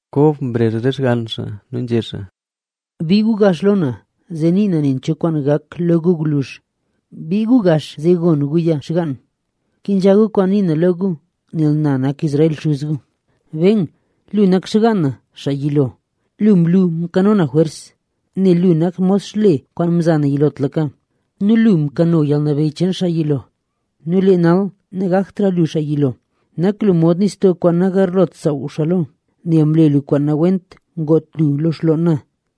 Kob mrezh re xgann xaa nu nzhé xaa: —Bii gu gax lo na, zee ni na nen cho kwaan gak lo gu gwluzh. Bii gax gu zee gon guya, xgaan. Kenzha gu kwaan nii na lo gu, nel na nak Israel, xuz gu. ’Ben, lu nak xgaan na xaa yilo. Lu mlu mkano na jwers, nel lu nak mod xle kwaan mza na yilotlaka nu lu mkano yalnabeyy cheen xaa yilo. Nu lee nal, nagaktra lu xaa yilo. Nak lu mod nistoo kwaan nagarlot saaw xaa lo, nel mle lu kwaan nawent ngoot lu lo xloon na,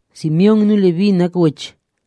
’Simeón nu Leví nak wech;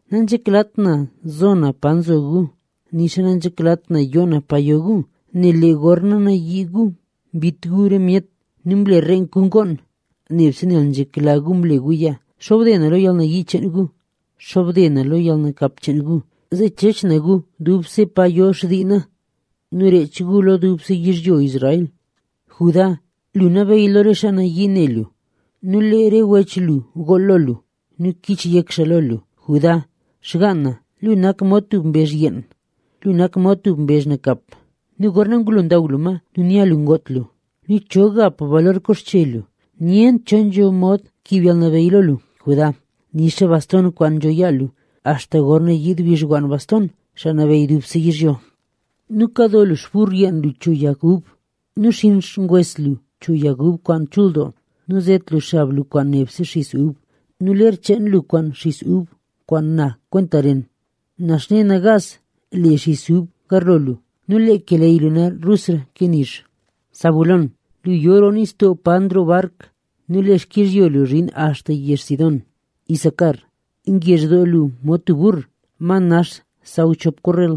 Nanzheklat na zo na pa nzo gu, nixa nanzheklat na yoo na pa yo gu. Nel lee gorna nayii gu mbit gu re myet; nu mle reenk gu ngoon, nebse nel nzhekla gu mle guya. ¡Xobde na lo yalnayii cheen gu! ¡Xobde na lo yalnakap cheen gu! Zee chech na gu dubse pa yo xtii na, nu reech gu lo dubse yizhyo Israel. ’Judá, lu nabeyy lo re xaa nayii ne lu nu lee re wech lu gool lo lu nu kich yek xaa lo lu. Judá, xgaan na, lu nak mod tub mbezh yeen. Lu nak mod tub mbezh nakap nu gorna ngulo ndaw lu ma nu nya lu ngoot lu nu, ¿cho gap balor koxche lu? Nyent cho nzho mod kiib yalnabeyy lo lu, Judá, nixa baston kwaan nzho yaa lu, axta gorna yiid xpixwann baston, xaa nabeyy dubse yizhyo. Nu kado lu xpur yenn lu cho yag ub nu xinn xngwes lu cho yag ub kwaan chul doo. Nu zet lu xab lu kwaan nebse xis ub nu ler cheen lu kwaan xis ub kwaan na kwenta ren. Naxne nagaas le xis ub garlo lu nu lee keleyy lu na rusra ke nizh. ’Zabulón, lu yo roo nistoo paro nroo bark nu lee xkizhyo lu zhin axta yezh Sidón. ’Isacar, ngezh doo lu mod tub bur, ma nax xsaw chop korrel.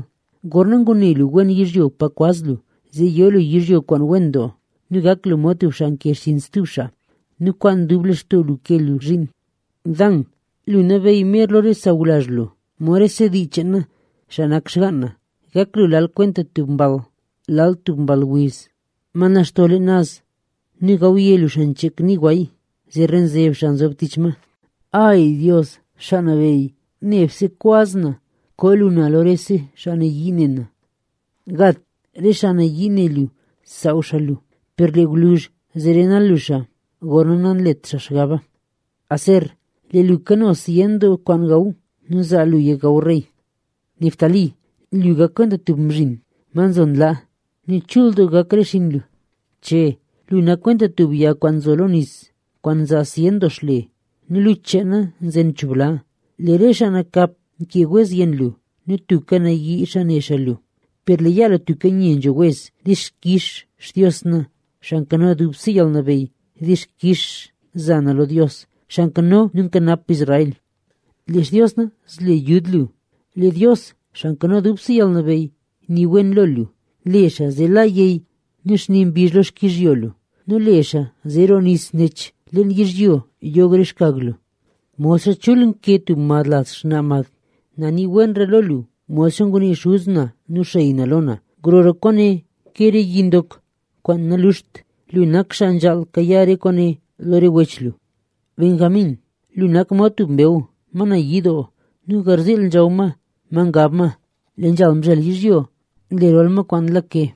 Gorna ngune lu wen yizhyo pa kwaz lu, zee yo lu yizhyo kwaan wen doo nu gak lu mod tub xaa nke xchinn lo stub xaa nu kwaan dub lextoo lu ke lu zhiin. ’Dan, lu nabeyy mer lo re sawlazh lu, mod rese dii cheen na, xaa nak xgaan na. Gak lu lal kwenta tub mball, lal kwenta tub mball wiz ma naxto leen naz. Nu gawye lu xancheek nii gway, zee renzeb xaa nzob tich ma. ’¡Ay, Xaa Nabeyy, nebse kwaz na koo lu na lo re xaa nayii ne na! ’Gad, re xaa nayii ne lu saaw xaa lu, per lee gwluzh zee renal lu xaa, gorna nanlet xaa xgaba. ’Aser, lee lu kano zyen doo kwaan gaw nu zaa luya gaw rey. ’Neftalí, lu gak kwenta tub mzhin ma nzo nlaa nu chul doo gak re xinn lu. ’Che, lu nak kwenta tub yag kwaan nzo roo nis, kwaan nzaa zyen doo xle. Nu luch cheena nzen cho bla. Lee re xaa nakap mkee wez yenn lu nu tubka nayii xaa ne xaa lu. Per lee yaa lu tubka nye nzho wez. ¡Dixkix Xtios na, Xaa Nkano Dubse Yalnabeyy! ¡Dixkix za na lo Dios, xaa nkano nu nkanap Israel! ¡Lee Xtios na, zle yud lu! ¡Lee Dios, Xaa Nkano Dubse Yalnabeyy, nii wen lo lu! Le xaa zee la yey nu xni mbizh lo xkizhyo lu nu le xaa zee roo nis nech leen yizhyo yog re xkag lu, modxa chul nke tub mad laz xnaa mad. Na nii wenra lo lu modxa ngunii xuz na nu xey na lo na. Grora kwaane ke re yi ndok kwaan naluxt. Lu nak xaa nzhaal kayaa re kwaane lo re wech lu. ’Benjamín, lu nak mod tub mbew ma nayii doo nu garziil nzhaw ma, ma ngab ma, lee mzhel yizhyo nle rol ma kwaan nlake.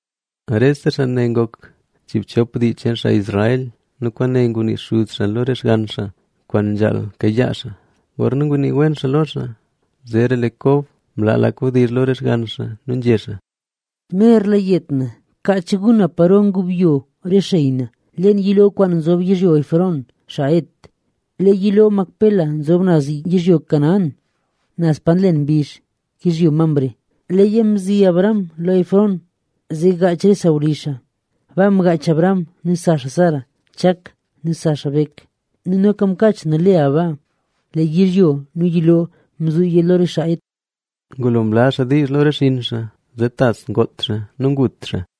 Rese xaa ne ngok chiibchop dii cheen Israel nu kwaane ngunii xuz xaa lo re xgann xaa kwaan nzhaal kayaa xaa, gorna ngunii wen xaa lo xaa. Zeera lee Kob mlaa lak wdizh lo re xgann xaa nu nzhé xaa: —Merla yet na. Kaach gu na paro ngubyo re xey na, leen yiloo kwaan nzob yizhyo Efrón, xaa Het. Lee yiloo Macpela nzob naz yizhyo Canaán, naz pa nlen mbizh, xkizhyo Mamre. Leeya mzi Abraham lo Efrón, zee gaach re sawlizh xaa. Baa mgaach Abraham nu sa xaa Sara, Chak nu sa xaa Bek nu noka mkaach na Lea baa. Lee yizhyo nu yiloo mzuuya lo re xaa Het. Ngulo mlaa xaa diizh lo re xinn xaa, zee tas ngoot xaa nu ngut xaa.